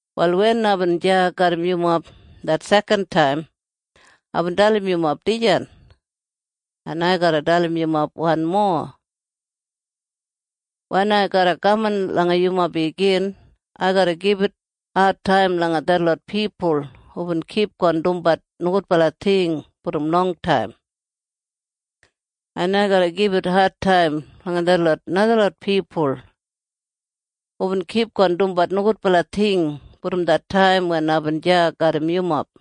Wal wen aibin deya garram yumob det sekantaim, aibin dalim yumob dijan. En ai garra dalim yumob wanmo. Wen ai garra kaman langa yumob igin, ai garra gibit adtaim langa detlot pipul hubin kipgon dumbat nogudbala ting brom longtaim, en ai garra gibit adtaim langa detlot najalot pipul hubin kipgon dumbat nogudbala ting brom det taim wen aibin deya garram yumob.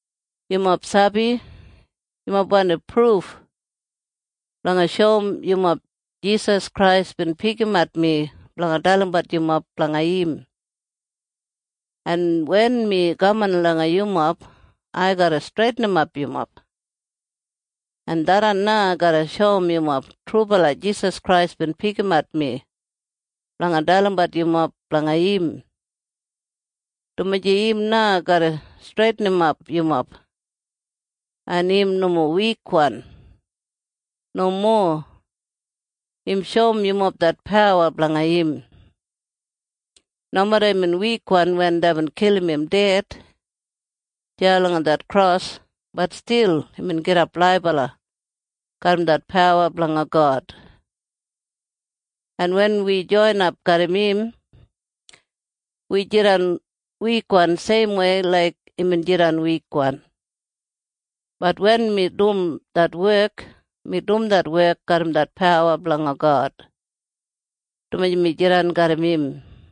Yumob sabi? Yumob wandim pruf blanga shoum yumob Jisas Krais bin pikimat mi blanga dalimbat yumob blanga im. En wen mi kaman langa yumob, ai garra streitinimap yumob. En tharran na garra shoum yumob trubala Jisas Krais bin pikimat mi blanga dalimbat yumob blanga im, dumaji im na garra streitinimap yumob. En im nomo wikwan. Nomo. Im shoum yumob det pawa blanga im. Nomeda imbin wikwan wen deibin kilim im ded deya langa det kros, bat stil imbin gidap laibala garram det pawa blanga God. En wen wi joinap garram im, wi jidan wikwan seimwei laik imbin jidan wikwan. Bat wen mi dum det wek, mi dum det wek garram det pawa blanga God, dumaji mi jidan garram im.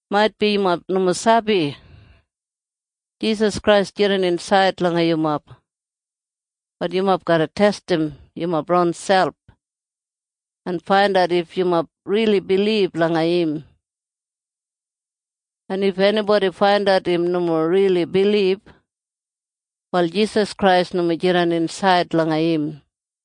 Maitbi yumob nomo sabi? Jisas Krais jidan insaid langa yumob. Bat yumob garra testim yumob ronselp en faindat if yumob rili bilib langa im. En if enibodi faindat im nomo rili bilib, wal Jisas Krais nomo jidan insaid langa im.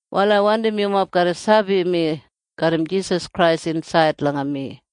Wal ai wandim yumob garra sabi mi garram Jisas Krais insaid langa mi.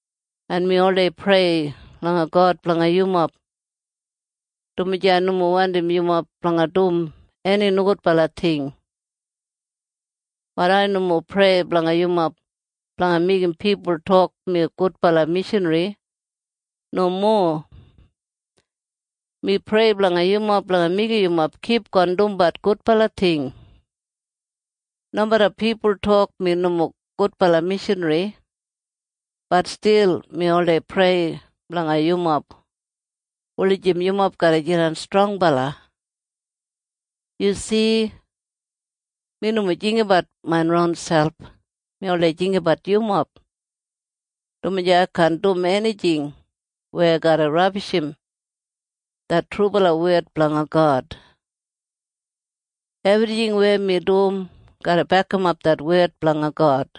En mi oldei prei langa God blanga yumob, dumaji ai nomo wandim yumob blanga dum eni nogudbala ting. Bat ai nomo prei blanga yumob blanga meigim pipul tok mi gudbala mishanri. Nomo. Mi prei blanga yumob blanga meigim yumob kipgon dumbat gudbala ting. Nomeda pipul tok mi nomo gudbala mishanri, bat stil mi oldei prei blanga yumob wulijim yumob garra jidan strongbala. Yu si? Mi nomo jinggabat main ronselp. Mi oldei jinggabat yumob, dumaji ai kaan dum enijing weya garra rabishim det trubala wed blanga God. Ebrijing weya mi dum garra bekimap det wed blanga God.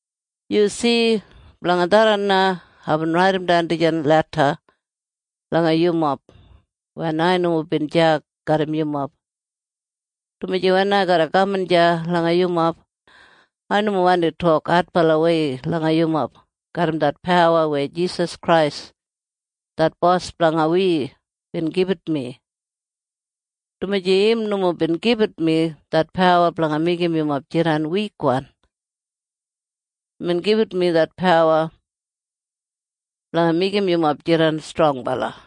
Yu si? Blanga tharran na aibin raidimdan dijan leda langa yumob wen ai nomo bin deya garram yumob, dumaji wen ai garra kaman deya langa yumob, ai nomo wandi tok adbalawei langa yumob garram det pawa weya Jisas Krais det Bos blanga wi bin gibit mi, dumaji im nomo bin gibit mi det pawa blanga meigim yumob jidan wikwan. Imbin gibit mi det pawa blanga meigim yumob jidan strongbala.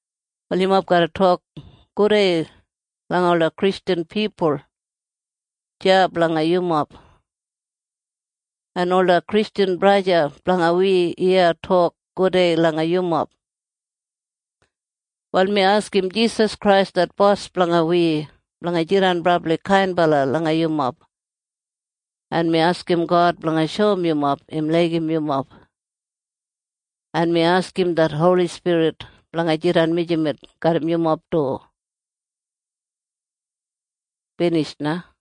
Wal yumob garra tok gudei langa ola Kristjan pipul deya blanga yumob. En ola Kristjan pipul blanga wi iya tok gudei langa yumob du. Wal mi askim Jisas Krais det Bos blanga wi blanga jidan brabli kainbala langa yumob, en mi askim God blanga shoum yumob im laigim yumob, en mi askim det Holi Spirit blanga jidan mijamet garram yumob du. Binij na.